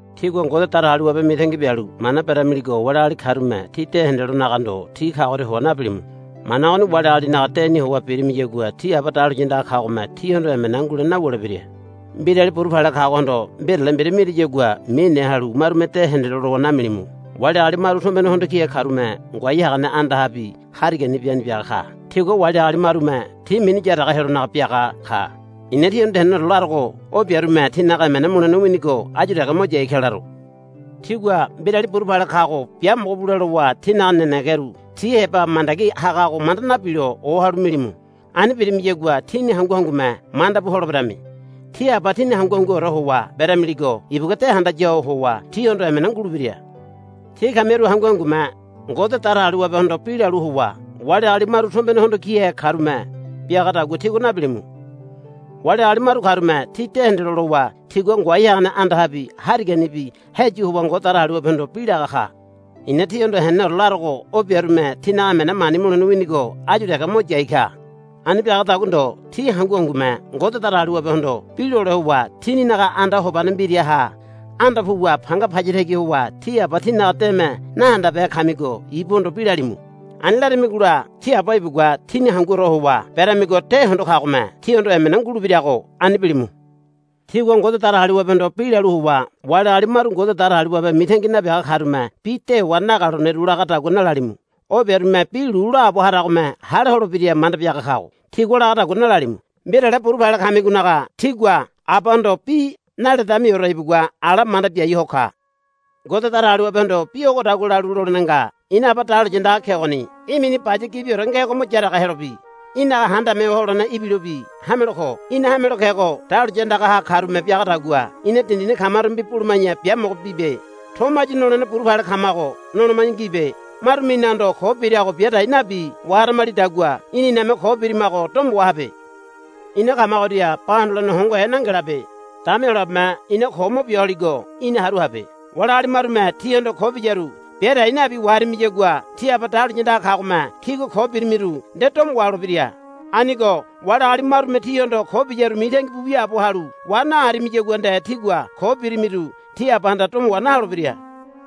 Tígua Ngode Datagaliwabe mitangi bialu mana beramiligo wali agali karume tí de hendelonaga ndo ti kagoria howa nabilimu. Mana ogoni wali agalinaga deni howa birimiyagua tí Aba dahuliya andaga kagome tíhondo emena ngulene nawulebira. Mbirali buru pale kagohondo mbirale mbira mirimiyagua mine halu marume de hendelo lowa namilimu. Wali agali maru tombene hondo kihe karume ngoai hagane andahabi hariganibi ani biaga ka. Tigua wali agali marume ti mini yaraga helonaga biaga ka. I̱na tíhondo henene larogo o biarume tinaga emena mulene winigo áyu dege mo yai ka laro. Tígua mbirali buru pale kago biamogo bule lowa tínaga nenegeru tí heba mandagi hagago manda nabilo o halu bilimu. Ani birimiyagua tíni hangu hangume manda bu holeberami. Tí Aba tíni hangu hanguore howa beramiligo ibugua de handaya ho howa tíhondo emena ngulebira. Tí kamiru hangu hangume Ngode Datagaliwabehondo bi lalu howa wali agali maru tombene hondo kihe karume biagadagua tígua nabilimu. Wali agali maru karume ti de hendelo lowa tigua ngoai hagane andahabi hariganibi heyu howa Ngode Datagaliwabehondo bi laga ka. I̱na tíhondo henene larogo o biarume tinaga emena mani mulene winigo áyu dege mo yai ka. Ani biagadagua ndo tí hangu hangume Ngode Datagaliwabehondo bi lole howa tíninaga anda hobane mbiraha anda puwa panga paya tagi howa tí Aba tínaga deme nahandabehe kamigo ibuhondo bi lalimu. Ani laramigola tí Aba ibugua tíni hanguore howa beramigo de hondo kagome tíhondo emena ngulebirago ani bilimu. Tígua Ngode Datagaliwabehondo bi lalu howa wali agali maru Ngode Datagaliwabe mitangi nabiaga karume bi dewa nagaloneru lagadagua nalalimu. O biarume bi lu laabo haragome hale holebira manda biaga kago tigua lagadagua nalalimu. Mbirale buru pale kamigonaga tígua Abahondo bi naledemiore ibugua ala manda biai ho ka. Ngode Datagaliwabehondo bi ogodagua lalu lolene nga. Ina Aba dahuliya andaga kegoni. Í̠ mini baya gibiore ngego mo yaraga helobi í̠naga Handame Ho Holene ibilobi hamelo ko. Í̠na hamelo kego dahuliya andagaha karume biagadagua ina dindini kamarumebi buluma̱ya biamogo bibe. Tomo áyu nolene buru pale kamago noloma̱ya ngibe. Marume inahondo ko birago bia dai nabi waharamalidagua í̠na iname ko birimago domo wahabe. Ina kamagoria ba hondolene hongohe nangelabe. Dama Heyolabeme ina ko mo bia holigo í̠na haru habe. Wali agali marume tíhondo ko biyaru bia dai nabi waharimiyagua tí Aba dahuliya andaga kagome tígua ko birimiru nde domo waholebira. Anigo wali agali marume tíhondo ko biyaru mitangi bu wiaabo halu wa naharimiyagua nde tígua ko birimiru tí Abahanda domo wa naholebira.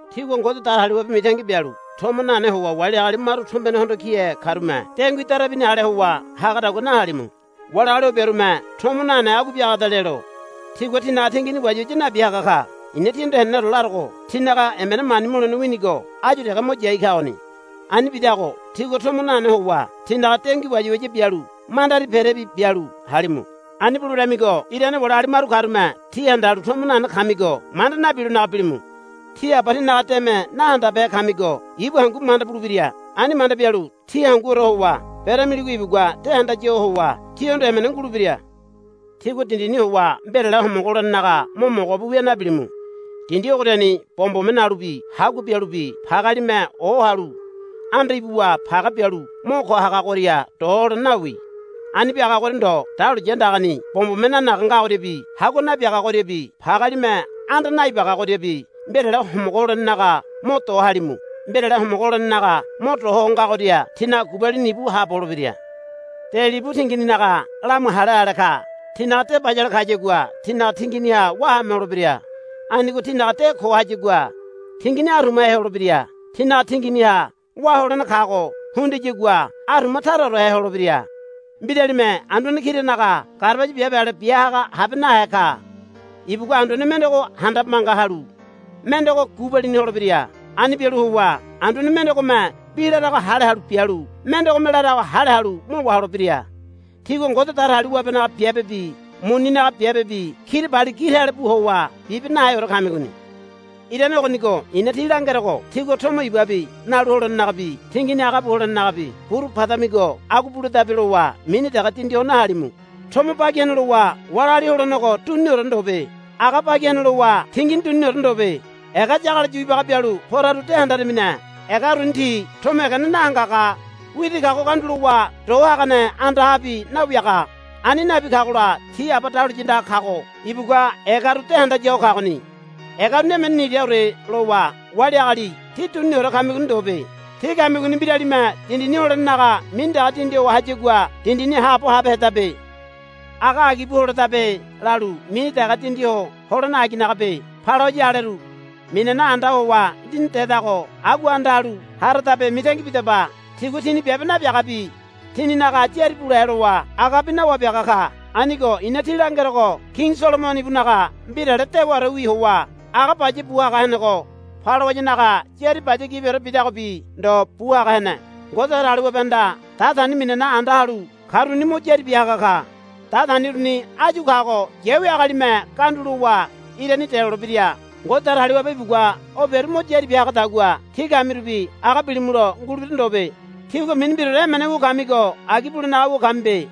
Tígua Ngode Datagaliwabe mitangi bialu tomo nane howa wali agali maru tombene hondo kihe karume dengui darabini ale howa hagadagua nahalimu. Wali agali o biarume tomo nane agua biagada lelo tigua tinaga tingini wayawaya nabi haga ka. I̱na tíhondo henenore larogo tinaga emena mani mulene winigo áyu dege mo yai kagoni. Ani bidago tígua tomo nane howa tínaga dengui wayawaya bialu mandari perebi bialu halimu. Ani buleberamigo irane wali agali maru karume tí handalu tomo nane kamigo manda nabilonaga bilimu. Tí Aba tínaga deme nahandabehe kamigo ibu hangu manda bulebira. Ani manda bialu tí hanguore howa beramiligo ibugua de handaya ho howa tíhondo emena ngulebira. Tígua dindini howa mbirale homogo holenenaga mo mogobu wia nabilimu. Dindi ogoriani bombome nalubi hagua bialubi pagealime ohalu anda ibuwa page bialu mo ko hagagoria do holene nawi. Ani biagagoria ndo dahuliya andagani bombome nanaga ngagoriabi hagua nabiagagoriabi pagealime anda naibagagoriabi mbirale homogo holenenaga mo do halimu. Mbirale homogo holenenaga mo do ho ngagoria tínaga gubalini íbu haabo holebira. De libu tingininaga lamu hale ale ka. Tínaga de bayale kayagua tínaga tinginiha wá haame holebira. Anigo tínaga de ko hayagua tingini arumahe holebira. Tínaga tinginiha wá holene kago hundiyagua aruma taraorehe holebira. Mbiralime anduane kiranaga garabaya biabe ale bia haga habe nahe ka. Ibugua anduane mendego handabe manga halu mendego gubalini holebira. Ani bialu howa anduane mendegome bi larago hale halu bialu mendegome larago hale halu mo waholebira. Tígua Ngode Datagaliwabenaga biabebi muninaga biabebi kirabali gi tale bu howa bibe naheore kamigoni. Irane ogonigo i̱na tí langerogo tígua tomo ibabi nalu holenenagabi tingini aga bu holenenagabi burupadamigo agua buledabe lowa mini dege dindi ho nahalimu. Tomo bagi hene lowa wali agali holenego duniniore ndobe. Aga bagi hene lowa tingini duniniore ndobe. Ega yagalo yu ibaga bialu poraru de handaramine. Ega uruni ti tomo egene nahangaga widi kago gandulowa do hagane andahabi nawiaga. Ani nabi kagola tí Aba dahuliya andaga kago ibugua egaru de handaya ho kagoni. Ega uruni emene niraore lowa wali agali tí duniniore kamigoni ndobe. Tí kamigoni mbiralime dindini holenenaga mini dege dindi ho hayagua dindini haabo habehedabe. Aga agi bu holedabe lalu mini dege dindi ho holene aginagabe. Palawaya aleru minana anda howa lini dedago agua anda halu haradabe mitangi bidaba. Tigua tini biabe nabiagabi tininaga yári bule lowa agabi nawabiaga ka. Anigo i̱na tí langerogo Kini Solomono ibunaga mbirale dewaorewi howa aga baya bu haga henego palawayanaga yári baya gibiore bidagobi ndo bu haga hene. Ngode Datagaliwabehanda datani minana anda halu karuni mo yári bia haga ka. Datani uruni áyu kago yawi agalime ganda lowa irani delolebira. Ngode Datagaliwabe ibugua o biaru mo yári bia hagadagua tí kamirubi aga bilimulo ngulebira ndobe. Tígua mini mbiraore emene wu kamigo agi bulenaga wu kamibe.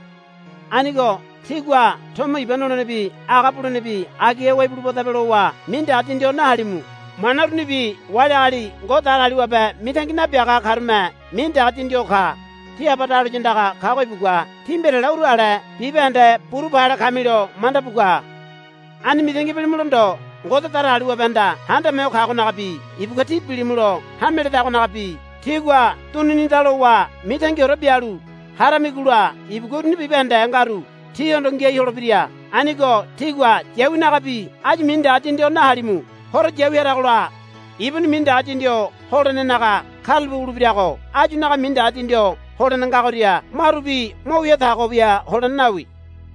Anigo tígua tomo iba nolenebi aga bulenebi agiha howa ibulubadabe lowa mini dege dindi ho nahalimu. Mana urunibi wali agali Ngode Datagaliwabe mitangi nabiaga karume mini dege dindi ho ka. Tí Aba dahuliya andaga kago ibugua tí mbirale uru ale bibahende buru pale kamilo manda bu ka. Ani mitangi bilimulo ndo Ngode Datagaliwabehanda Handame Ho Kagonagabi ibugua tí bilimulo hame ledagonagabi tígua duninida lowa mitangiore bialu haramigola ibugua uruni bibahende ngaru tíhondo ngiai holebira. Anigo tígua yawinagabi áyu mini dege dindi ho nahalimu. Horo yawi haragola ibuni mini dege dindi ho holenenaga karulape wulebirago áyunaga mini dege dindi ho holene ngagoria marubi mo wia tago bia holene nawi.